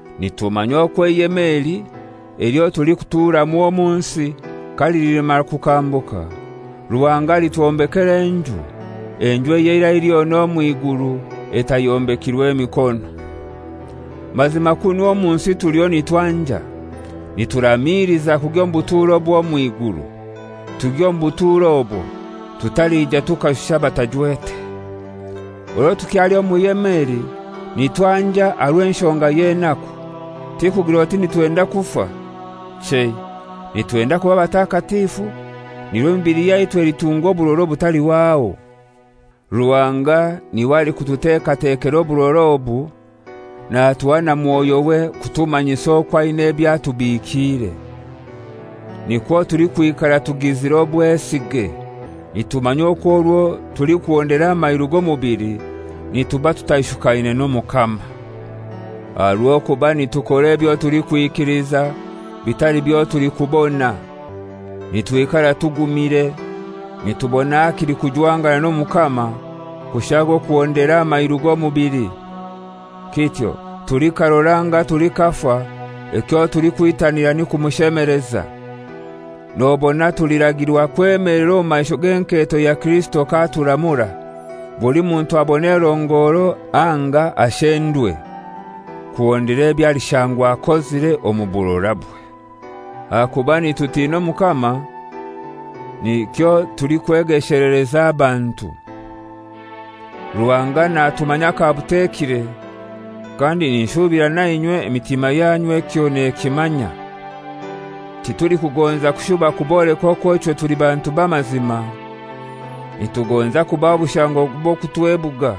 Nitumanya okwo eihema eli elyo tulikuturamu omu nsi kalilimara kukambuka, Ruhanga alitwombekera enju, enju ey'eirai lyona omw'iguru, etayombekirwe mikono. Mazima kunu omu nsi tuliho nitwanja, nituramiiliza kugya omu buturo obw'omw'iguru, tugye omu buturo obwo, tutalija tukashusha abatajwete. Orwo tukyali omw'ihema eli nitwanja aha rw'enshonga y'enaku, ti kugir'oti nitwenda kufa, chei, nitwenda kuba batakatifu, nirwo emibili yaitu elitungwa oburora obutalihwaho. Ruhanga n'iwe alikututekatekera oburora obu, natuha na Mwoyowe kutumanyisa okwo aina ebyo atubikiire. Nikwo tulikwikara tugizire obwesige. Nitumanya okwo orwo tulikuhondera amairu g'omubili nituba tutaishukaine n'Omukama, aha rw'okuba nitukora ebyo tulikwikiliza, bitali byotulikubona. Nitwikara tugumire, nitubona hakili kujwangana n'Omukama kushaga okuhondera amairu g'omubili. Kityo tulikarora anga tulikafa, ekyo tulikwitanira ni kumushemeleza. Nobona tuliragirwa kwemelera omu maisho g'enketo ya Kirisito k'aturamura, buli muntu abone erongoro anga ashendwe, kuhondera ebyo alishangwa akozire omu burorabwe. Ahakuba nitutina Omukama, nikyo tulikwegeshelereza abantu. Ruhanga natumanya kabutekire, kandi ninshubira na inywe emitima yanyu ekyo nekimanya. Titulikugonza kushuba kuboleka okwo ichwe tuli bantu b'amazima, nitugonza kubaha obushango bw'okutwebuga,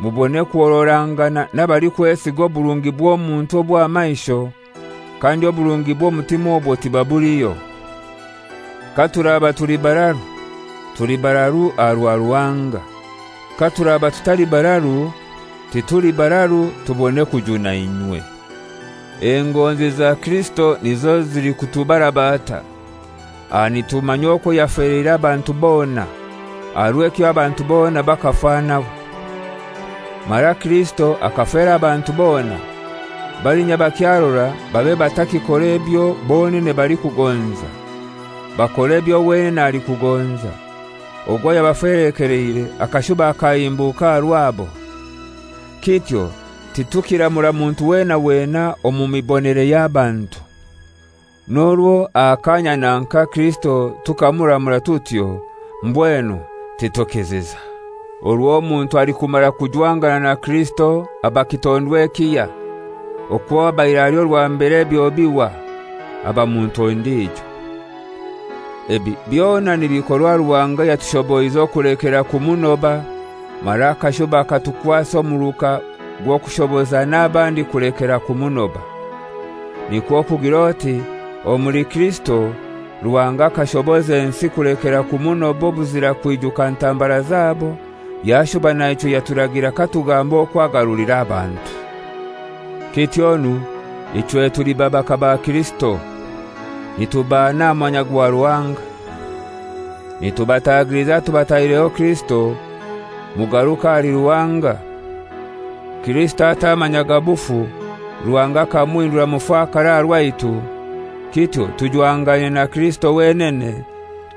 mubone kuhororangana n'abalikwesiga oburungi bw'omuntu obw'aha maisho, kandi oburungi bw'omutima obwo tibabuliho. Katuraba tuli bararu, tuli bararu aha rwa Ruhanga; katuraba tutali bararu, tituli bararu tubone kujuna inywe. Engonzi za Kirisito nizo zilikutubarabata, aha nitumanya okwo yafeleire abantu bona; aha rw'ekyo abantu bona bakafa nawe. Mara Kirisito akafera abantu bona, balinya abakyarora babe batakikora ebyo bonene balikugonza, bakore ebyo wenene alikugonza, ogwo ayabafelekeleire akashuba akahimbuka aha rwabo. Kityo titukiramura muntu wena wena omu mibonere y'abantu. N'orwo aha kanya nanka Kirisito tukamuramura tutyo, mbwenu titukiziza. Orwo omuntu alikumara kujwangana na Kirisito aba kitondwa ekihya; okwo abaire ali orwa mbere ebyo bihwa, aba muntu ondijo. Ebi byona nibikorwa Ruhanga ayatushoboize okulekera kumunoba mara akashuba akatukwasa omuruka gw'okushoboza n'abandi kulekera kumunoba. Nikwo kugir'oti omuli Kirisito Ruhanga akashoboza ensi kulekera kumunoba obuzira kwijuka ntambara zabo yashuba naichwe yaturagira katugamba okwo agarulira abantu. Kityonu ichwe tuli babaka ba Kirisito, nitubahana aha mwanya gwa Ruhanga. Nitubatagiliza tubataireho Kirisito, mugaruke ahali Ruhanga. Kirisito atamanyaga bufu Ruhanga akamuhindura mufakare aha rwaitu, kityo tujwangaine na Kirisito wenene,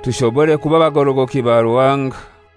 tushobore kuba bagorogoki ba Ruhanga.